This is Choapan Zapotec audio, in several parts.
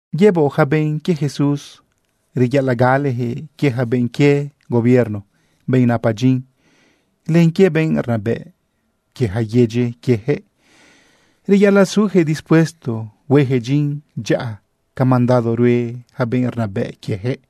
Yëboꞌ yaca benꞌ quie Jesús reyaꞌalaꞌ galejëꞌ quie yaca benꞌ quie gobierno, benꞌ napa dyin, len quie benꞌ rnabëꞌ quie yaca yedyi quieyaquëꞌ. Reyaꞌalaꞌ sujëꞌ dispuesto huejëꞌ dyin dyaꞌa ca mandado rue yaca benꞌ rnabëꞌ quiejëꞌ.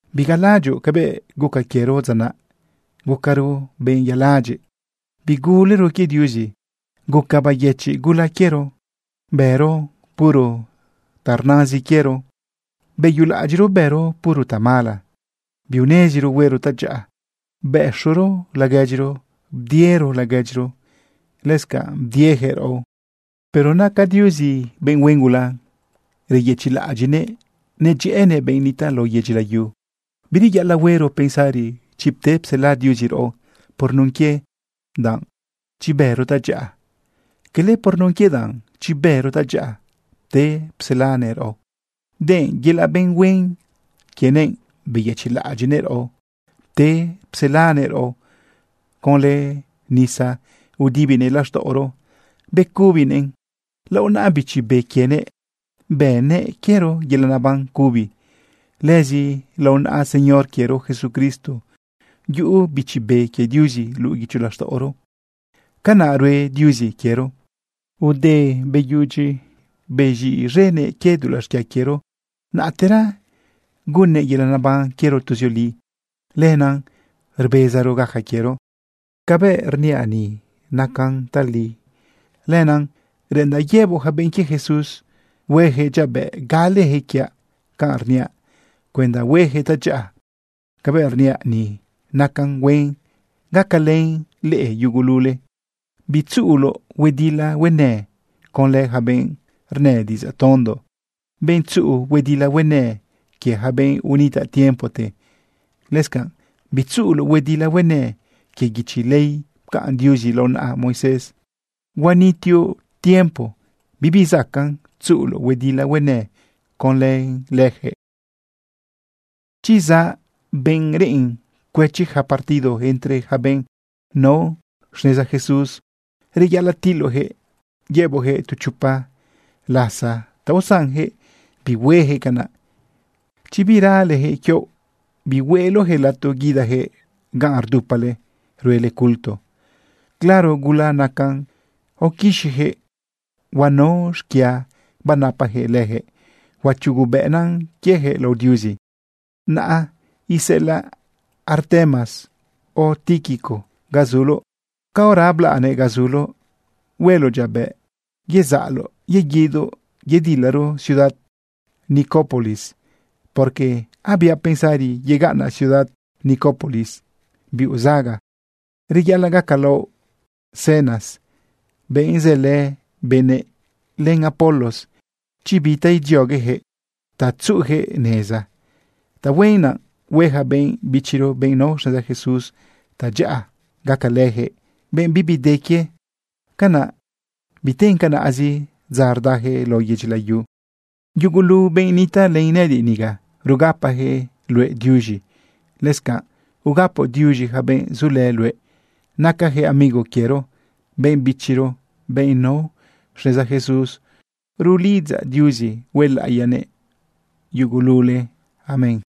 Bigalaꞌadyoꞌ cabëꞌ guca quiero dza naꞌ. Gucaro benꞌ yaladyiꞌ, bigulero quie Diuzi. Guca bayëchiꞌ gula quiero, bëro puro ta rnazin quiero. Beyulaꞌadyiꞌro bëro puro tamala, biuneziro huero tadyaꞌa. Bez̃ëꞌro laguedyiro, bdiero laguedyiro, lëscanꞌ bdieyaquëꞌ raꞌo. Pero naca Diuzi benꞌ huen gula reyëchiꞌlaꞌadyiꞌnëꞌ nedyëꞌënëꞌ benꞌ nitaꞌ lao yedyi layu. Bireyaꞌalaꞌ huero pensari chi pte psela Diuzi raꞌo por nun quie danꞌ chi bëro tadyaꞌa. Quele por nun quie danꞌ chi bëro tadyaꞌa pte pselanëꞌ raꞌo, denꞌ yelaꞌ benꞌ huen quienëꞌ beyëchiꞌlaꞌadyiꞌnëꞌ raꞌo pte pselanëꞌ raꞌo. Conlë nisa udibinëꞌ laxtaꞌoro becubinëꞌn. Lao naꞌa Bichi Be quienëꞌ bënnëꞌ quiero yelaꞌ neban cubi. Lëzi lao naꞌa Señor quiero Jesucristo yuꞌu Bichi Be quie Diuzi luꞌu guicho laxtaꞌoro. Canaꞌ rue Diuzi quiero. Te beyudyi bez̃iꞌz̃enëꞌ quie dulaꞌ xquia quiero, naꞌtera gunnëꞌ yelaꞌ naban quiero tuzioli. Lenaꞌ rbezaro gaca quiero. Cabëꞌ rniaꞌ ni nacan tali. Lenaꞌ reꞌendaꞌ yëboꞌ yaca benꞌ quie Jesús huejëꞌ dyabëꞌ galeyaquëꞌ quiaꞌ canꞌ rniaꞌ cuenda huejëꞌ tadyaꞌa. Cabëꞌ rniaꞌ ni nacan huen gacalën leꞌe yugulule. Bitzuꞌuloꞌ huedila huenë conlë yaca benꞌ rnë diꞌidzaꞌ tondo, benꞌ tzuꞌu huedila huenë quie yaca benꞌ unitaꞌ tiempote. Lëscanꞌ bitzuꞌuloꞌ huedila huenë quie guichi ley pcaꞌn Diuzi lao naꞌa Moisés. Huanitioꞌ tiempo bibi zacaꞌn tzuꞌuloꞌ huedila huenë conlë leyaquëꞌ. Chi zaꞌ benꞌ reꞌen cuëchi ja partido entre yaca benꞌ nao xneza Jesús, reyaꞌalaꞌ tiloꞌjëꞌ yëboꞌjëꞌ tu chopa lasa ta usanjëꞌ bihuejëꞌ canaꞌ. Chi biralejëꞌ quioꞌ, bihueꞌloꞌjëꞌ lato guidayaquëꞌ ganꞌ rdupale ruele culto. Claro gula nacan aoquixiyaquëꞌ, huanao xquia banapajëꞌ lëjëꞌ, huachugubëꞌna quieyaquëꞌ lao Diuzi. Naꞌ iseꞌelaꞌ Artemas o Tíquico ga zuloꞌ. Caora ablaꞌnëꞌ ga zuloꞌ, hueloꞌ dyabëꞌ yezaꞌloꞌ yeguidoꞌ yedilaro ciudad Nicópolis, porque abiaꞌ pensari yegaꞌnaꞌ ciudad Nicópolis biuꞌ zaga. Reyaꞌalaꞌ gacalaoꞌ Zenas, benꞌ sëlë benëꞌ, len Apolos chi bi ta idziogueyaquëꞌ ta tzuꞌuyaquëꞌ neza. Tahuen naꞌ hue yaca benꞌ bichiro, benꞌ nao xneza Jesús, tadyaꞌa gacalëyaquëꞌ benꞌ bibi de quie. Canaꞌ biten canaꞌzi dza rdayaquëꞌ lao yedyi layu. Yugulu benꞌ nitaꞌlë nëꞌëdiꞌ niga, rugapayaquëꞌ luëꞌ diuz̃i. Lëscanꞌ ugapoꞌ duiz̃i yaca benꞌ zulë luëꞌ. Nacayaquëꞌ amigo quiero, benꞌ bichiro, benꞌ nao xneza Jesús. Rulidzaꞌ Diuzi huelaꞌiyanëꞌ yugulule. Amén.